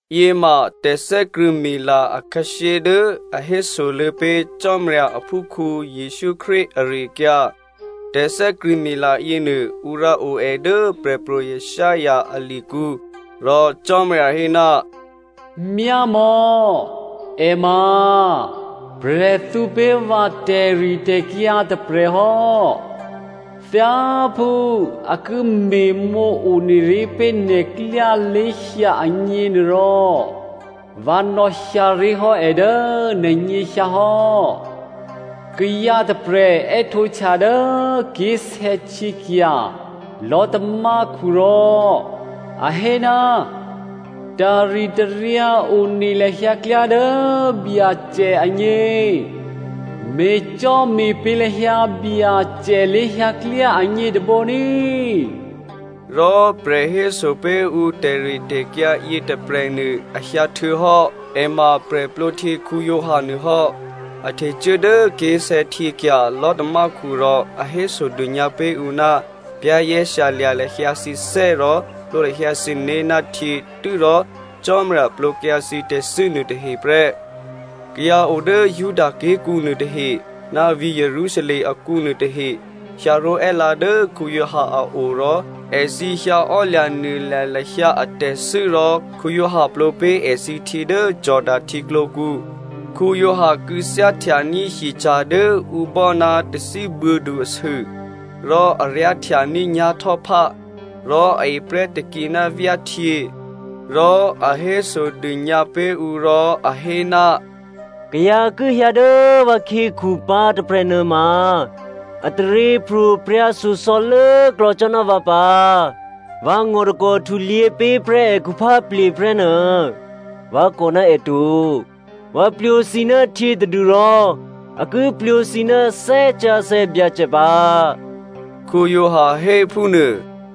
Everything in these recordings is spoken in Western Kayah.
Yěma tè̤thè́krṳ̂̌mila akhǎshyé dố a hésoluô̌ pé̤ Cò́marya aphúkhǔ Jesǔ Krístu ari-akyǎ. Tè̤thè́krṳ̂̌mila yěnuô ǔ rǎ o è dố Prè̤pro̤ Isaiah alikǔ, rò Cò́marya hé, “Myámò̌, è ma prè̤thǔ pé̤ vǎ tè̤ritè̤kyǎ tôprè̤hò́, thyáphú a ki me̤mǒ one ré̤ pé̤ nè̤klyá lé̤hyǎ agněnuôrò, vǎ nò̌hyǎ ré̤hò́ è dố nè̤nyěhyǎ hò́, kayǎ tôprè̤ è́htǒhtya dố ké̤sè̌htyěkya̤ lò̤́tamákhu rò a hé, ‘Taritaryǎ one lahyǎ klyá dố Byacè agně. Me̤cò́me̤pě̤ lahyǎ Byacè lé̤hyǎklyá agně tôbǒ ní꤮.’” Rò prè̤ héso pé̤ ǔ tè̤ritè̤kyǎ yětôprè̤nuô a hyǎ htuô̌hò́. È ma Giovanni Baptista nuô hò́. A htecuố dố ké̤sè̌htyěkya̤ lò̤́tamákhu rò a hésodônyǎ pé̤ ǔ ná za̤ ní̤dû lahyǎ thǐné̤ rò plwǒ lahyǎ thǐné̤ ná htyě tû́rò Cò́marya plwǒkyǎ thǐ tè̤thû́ nuôtahe prè́. Kayǎ o dố Juda ké̤kǔ nuôtahe ná vǐ̤ Jerusalem akǔ nuôtahe hyǎró̤è́lǎ dố Giovanni a o rò èthǐ hyǎ ò́lya̤nuôlya̤ lahyǎ atè̤thû́ rò Giovanni plwǒ pé̤ èthǐ htyě dố Jordano htyěklǒkǔ. Giovanni kû̌thyáhtyaní̤ hyeca̤ dố ǔ bò́ ná tathíbuô̌du asû, rò a ryá̤htyaní̤ nyá̤htò́phá. Rò a eprè́ takǐ ná vyáhtyě. Rò a hésodônyǎ pé̤ ǔ rò a hé, “Kayǎ ki hyǎ dố vǎkhyěkhu pǎ tôprè̤ nuôma, a taryěpro̤prya̤ shyosò̌ lốklò̌ cò́ ná vǎ pǎ. Vǎ ngò̤takò̤ htulyě pé̤ prè́ è khupháplye̤ prè́ nuô vǎ kò ná è to. Vǎ plwǒ thǐ ná htyě tadû́rò a ki plwǒ thǐ ná Thè́ Sǎsè̌ Byacè pǎ,” Giovanni hé phúnuô.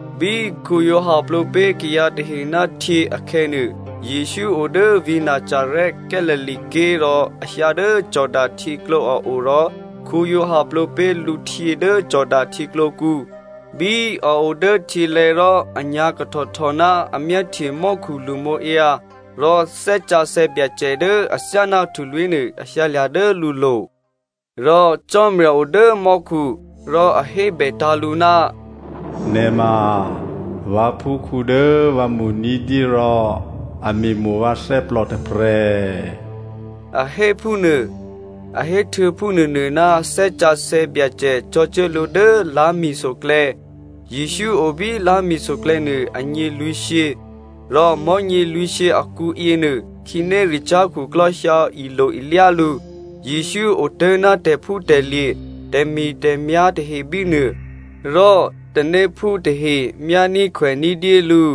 Bí Giovanni plwǒ pé̤ kayǎ tahe ná htyě akhè̌nuô, Jesǔ o dố vǐ̤ Nazarè Galilea ké̤ rò a hyǎ dố Jordanohtyěklǒ a o rò Giovanni plwǒ pé̤ lǔhtyě dố Jordano htyěklǒkǔ. Bí a o dố htyělè̤̌ rò a nyǎ̤kahtòhtò ná a myáhtye mò́khu lṳmǒǎyǎ rò Thè́ Sǎsè̌ Byacè dố athyáná htulwí̤ nuô a hyǎlya̤ dố lǔlo̤. Rò Cò́marya o dố mò́khu, rò a hébètǎ̤ lǔ, “Nè̤ ma vǎphúkhǔ dố vǎ mo̤ ní̤dyé rò a me̤mo̤ vǎ thè́plò tôprè̤,” a hé phúnuô. A héhtuô̌ phúnuônuô, Thè́ Sǎsè̌ Byacè cò̤̌cuố lǔ dố lá̤mi̤soklè̌. Jesǔ o bí lá̤mi̤soklè̌ nuô anyě lwǐ̤shyě, rò mò̤́nyě lwǐ̤shyě akǔ yěnuô, khǐnéricyá̤ khuklò́ hyǎ ilo-ilyá lǔ. Jesǔ otố̤ ná tè̤phútè̤lye̤, tè̤mi̤tè̤myá̤ tahe bínuô, rò tanéphú tahe myání̤khwèní̤ dyé lǔ.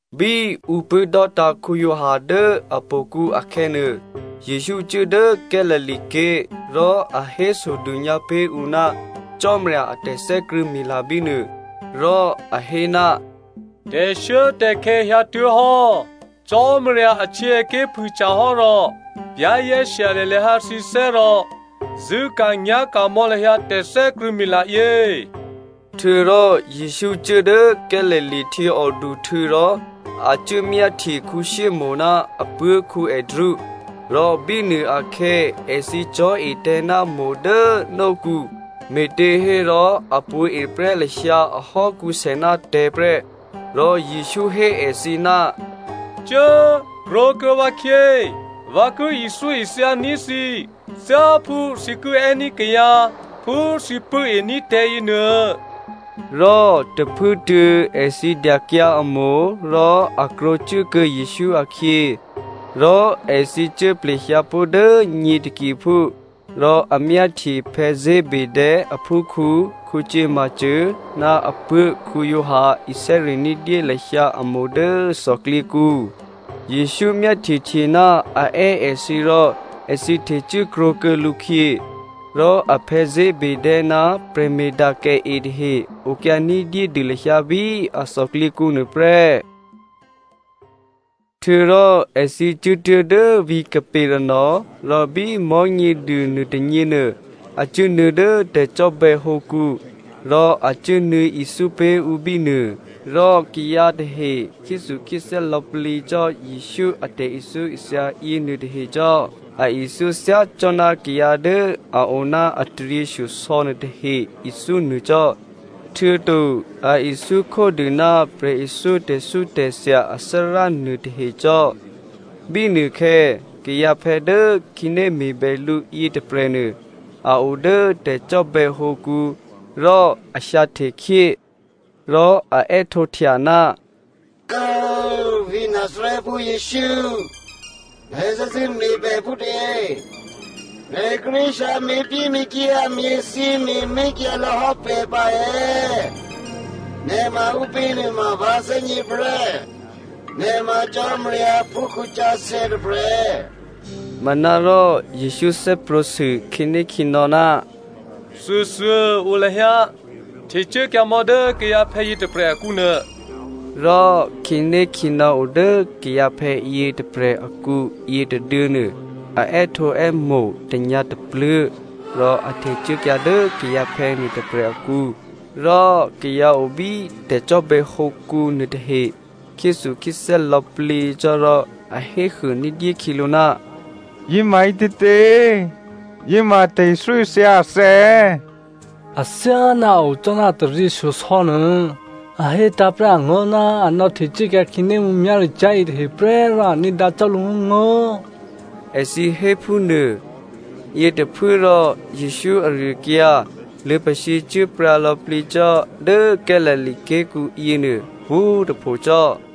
Bí ǔ pṳ̂́dò́tǎ̤ Giovanni dố htò̌kǔ akhè̌nuô, Jesǔ cuố dố Galilea ké̤ rò a hésodônyǎ pé̤ ǔ ná Cò́marya a tè̤thè́krṳ̂̌mila bínuô. Rò a hé, “Tè̤shuốtè̤khè̌ hyǎtuố̤hò́. Cò́marya ahtyěaké̤ phûhtyahò́ rò za̤ ní̤dû lahyǎ thǐné̤ rò zṳ̂́ka̤nyá̤ka̤ mò̌ lahyǎ tè̤thè́krṳ̂̌mila yě.” Htuô̌rò Jesǔ cuố dố Galilea htyěòduhtû̌ rò a cuốmyáhtye Simonè ná apuố̤ Andrea. Rò bínuôakhè̌ èthǐ cò̤́etè̤̌ ná itavǐ dố nókǔ, me̤těhérò a pṳ̌eprè́ lahyǎ ahò́kǔsè ná tè̤̌ prè́. Rò Jesǔ hé èthǐ, “Cuố꤮ krwǒkuô̌ vǎkhyě. Vǎ ki ithyóithya ní̤ thǐ thyáphú thǐ ki è́ní̤ kayǎ phú thǐ pṳ̂́e ní̤ tè̤̌yě nuô.” Rò tôphuốtuô̌ èthǐ dyakyǎ a itavǐ rò a krwǒkuô̌ Jesǔ akhyě. Rò èthǐ cuố plehyǎ pó̤ dố nyě takiphú rò a myáhtye Zebedeo aphúkhǔ Jakomo ná apuố̤ Giovanni isè́ri̤ ní̤dyé lahyǎ a itavǐ dố thòklyěkǔ. Jesǔ myáhtyehtyená a è́ èthǐ rò èthǐ htecuố krwǒkuô̌ lǔkhyě. Rò aphè̌ Zebedeo ná prè̤me̤dakèe tahe okyǎ ní̤dyédû lahyǎ bí a thòklyěkǔ nuôprè́. Htuô̌rò èthǐ cuốtuố̤ dố vǐ̤ Capernaum rò bí Mò̤́nyěduô nuôtônyěnuô, a cuốnuô̌ dố tè̤cò́bè̌hǒkǔ rò a cuốnuô̌ ithyó pé̤ ǔ bínuô. Rò kayǎ tahe khyéthukhyéthè́ lò̌plǐ cò́ Jesǔ a tè̤ithyóithya yěnuôtahe cò́. A ithyó thyá cò́ ná kayǎ dố a o ná a taryěshyosò̌ nuôtahe ithyó nuô cò́, htuô̌to a ithyó khódû ná prè̤ithyó tè̤thyótè̤thya athárá nuôtahe cò́. Bínuôkhè̌ kayǎphè̌ dố khǐné me̤bè lǔ yětôprè̤nuô, a o dố tè̤cò́bè̌hǒkǔ rò a hyǎhte khyé. Rò a è́htǒhtya, “Kố꤮ vǐ̤ Nazarèphú Jesǔ꤮, nè̤ thè́zṳ̂́ me̤ pè̤ phútě? Nè̤ kíré̤ hyǎ me̤pyéme̤kyǎ me̤thyěme̤mé̤ kyǎlò̌hò́ pè̤ pǎ è̌? Nè̤ ma ǔpě nuôma vǎ thè́gně prè́, nè̤ ma Cò́marya aphúkhǔ sǎsè̌ tôprè̤.” Manárò Jesǔ thè́prwǒ̤ sû khǐnékhǐnò̌, “Thuôthuô꤮ o lahyǎ, htecuốkyǎmò̌ dố kayǎphè̌ yětôprè̤ akǔnuô.” Rò khǐnékhǐnò̌ o dố kayǎphè̌ yětôprè̤ akǔ yětôduô̌nuô, a è́htǒè́mo̤ tanyǎ̤tapluố̤ rò a htecuốkyǎ dố kayǎphè̌ nuôtôprè̤ akǔ. Lò̌꤮ kayǎ obí tè̤cò́bè̌hǒkǔ nuôtahe khyéthukhyéthè́ lò̌plǐ cò́ rò a héhuô ní̤dyé khyělǔ, “Yěma ǐtětě? Yěma tè̤ithyóithya athè̌ è̌? Athyáná a o cò́ ná a taryěshyosò̌ nuô. A hétǎ̤ prè́ angó̤ ná a nò̌htecuốkyǎ khǐné mǔmyá̤ricyá̤ yětahe prè́ rò a ní̤dǎ cò́ lǔngó̤ngó̤,” èthǐ hé phúnuô. Yětôphuốrò Jesǔ ari-akyǎ luô̌pasǐ cuốpryǎ lò̌plǐ cò́ dố Galilea ké̤kǔ yěnuô pwǒ̤꤮ tôphocò́.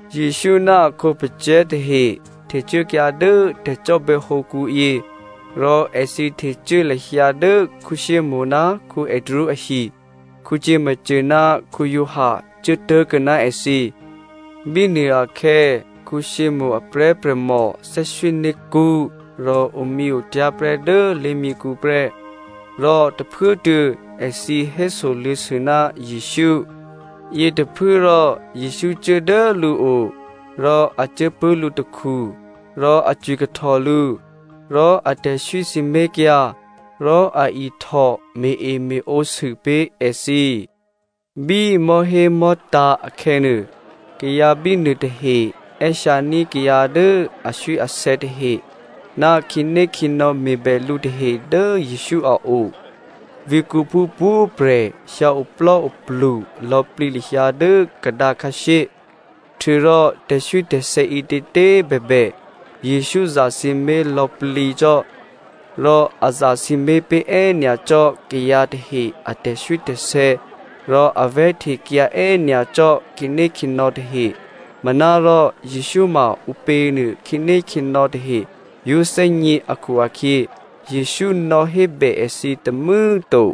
Jesǔ ná a khǒpacè̤̌ tahe htecuốkyǎ dố tè̤cò́bè̌hǒkǔ yě rò èthǐ htecuố lahyǎ dố Simonè ná Andrea ahi. Jakomo ná Giovanni cuố tố̤kuô̌ ná èthǐ. Bínuô akhè̌ Simonè a prè̤́prè̤mò thè́swíné̤kṳ́ rò omyěotyá̤ prè́ dố lé̤myěkhu prè́, rò tôphuốtuô̌ èthǐ hésoluô̌sû ná Jesǔ. Yětôphuốrò Jesǔ cuố dố lǔo rò a cuốpṳ̂́ lǔtakhu rò a cwikahtò lǔ. Rò a tè̤swí sǐmé̤kyǎ rò a ihtò me̤-eme̤ǒsû pé̤ èthǐ. Bí mò̤́hémò̤́tǎ̤ akhè̌nuô, kayǎ bínuô tahe è́hyǎní̤ kayǎ dố aswíasè̌ tahe ná khǐnékhǐnò̌ me̤bè lǔ tahe dố Jesǔ a o. Vǐ̤kǔphú pwǒ̤꤮ prè̤ hyǎ oplò́oplu lò̌plǐ lahyǎ dố kadǎ khǎshyé. Htuô̌rò tè̤swítè̤sè̌ ǐtětě꤮ bèbè Jesǔ zasǐmé̤ lò̌plǐ cò́. Rò a zasǐmé̤ pé̤ è́nyacò́ kayǎ tahe a tè̤swítè̤sè̌ rò a vè̤́htekyǎ è́nyacò́ khǐnékhǐnò̌ tahe, manárò Jesǔ ma ǔpěnuô khǐnékhǐnò̌ tahe yǒ thè́gně akhu-akhyě, Jesǔ nò̌hébè èthǐ tômû̌꤮ to.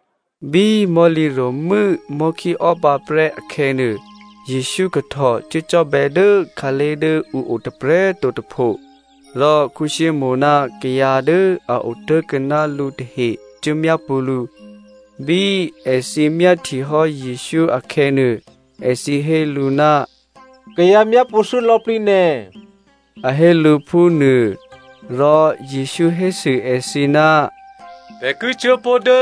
Bí mò̤́lǐ ro̤mû́ mò̤́khíò́ pǎprè́ akhè̌nuô, Jesǔ kahtò cuốcò́bè̌ dố khǎlé̤ dố ǔ o tôprè̤꤮ to tôpho. Rò Simonè ná kayǎ dố a otố̤kuô̌ ná lǔ tahe cuố myápṳ̌ lǔ. Bí èthǐ myáhtye hò́ Jesǔ akhè̌nuô, èthǐ hé lǔ, “Kayǎ myápṳ̌thû́ lò̌plǐ nè̤,” a hé lǔ phúnuô. Rò Jesǔ hésû èthǐ, “Pè̤ ki cuố pó̤ dố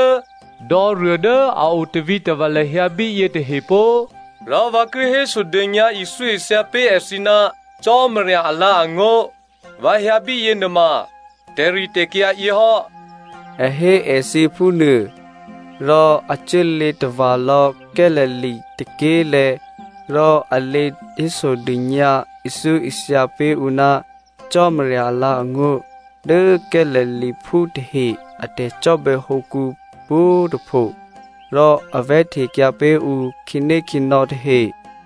dò̌ruô dố a o tavǐtava̤ lahyǎ bíyě tahe pó꤮, rò vǎ ki hésodônyǎ ithyóithya pé̤ èthǐ ná Cò́marya alǎ̤angó̤. Vǎ hyǎ bíyěnuôma tè̤ritè̤kyǎ yěhò́,” a hé èthǐ phúnuô. Rò a cuốlě tava̤lò̌ Galilea tôké̤lè̤̌ rò a lě hésodônyǎ, ithyóithya pé̤ ǔ ná Cò́marya alǎ̤angó̤ dố Galileaphú tahe a tè̤cò́bè̌hǒkǔ pwǒ̤꤮ tôpho, rò a vè̤́htekyǎ pé̤ ǔ khǐnékhǐnò̌ tahe.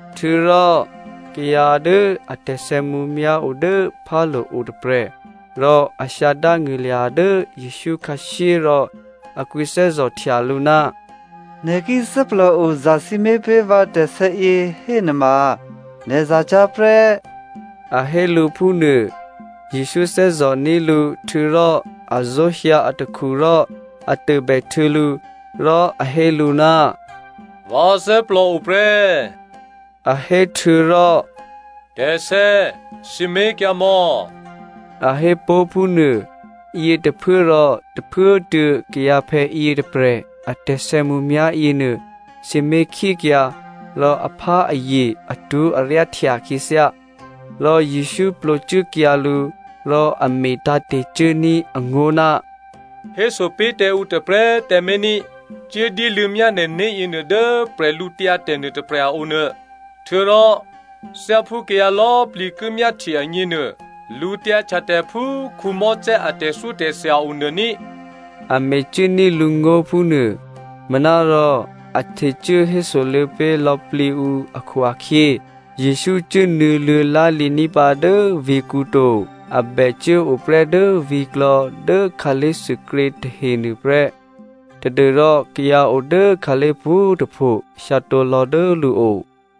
Htuô̌rò kayǎ dố a tè̤sè̌mǔmyá̤ o dố phálo̤ otôprè̤, rò a hyǎ dángṳ̂lya̤ dố Jesǔ khǎshyé rò a kwǐthè́zò̤htya lǔ, “Nè̤ ki thè́plòo zasǐmé̤ pé̤ vǎ tè̤sè̌yě hénuôma nè̤ za cyá̤ prè́,” a hé lǔ phúnuô. Jesǔ thè́zò̤ní̤ lǔ, htuô̌rò a zó̤hyǎ atakhu rò a tôbèhtuô̌ lǔ rò a hé lǔ, “Vǎ thè́plòo prè́,” a hé htuô̌rò “Tè̤sè̌꤮ sǐmé̤kyǎmò̌,” a hé pó̤ phúnuô. Yětôphuốrò tôphuốtuô̌ kayǎphè̌ yětôprè̤ a tè̤sè̌mǔmyá̤ yěnuô sǐmé̤khyékyǎ rò apháazye atwó̤aryáhtya khyěthyá. Rò Jesǔ plwǒcuốkyǎ lǔ rò a metǎ̤te̤ cuốní̤ angó̤, “Héso pé̤ tǎ ǔ tôprè̤꤮ tǎmé̤ ní꤮. Cuố dyéluô̌myá nè̤né̤ yěnuô dố bwídu nuôtôprè̤ a o nuô, htuô̌rò thyáphú kayǎ lò̌plǐ ki myáhtye agněnuô, lǔtyǎhtyatè̤ phú Mosè a tè̤thyótè̤thya onuô ní,” a mecuốní̤ lǔ ngó̤ phúnuô. Manárò a htecuố hésoluô̌ pé̤ lò̌plǐ ǔ akhu-akhyě, Jesǔ cuốnuô̌ luô̌ lá̤lǐní̤ pǎ dố vǐ̤kǔ to, a bè cuốo prè́ dố vǐ̤klò̌ dố khǎlé̤thuôkrě tahenuô prè́ tadû́rò kayǎ o dố khǎlé̤ pwǒ̤꤮ tôpho hyǎtǒ lò̌ dố lǔo.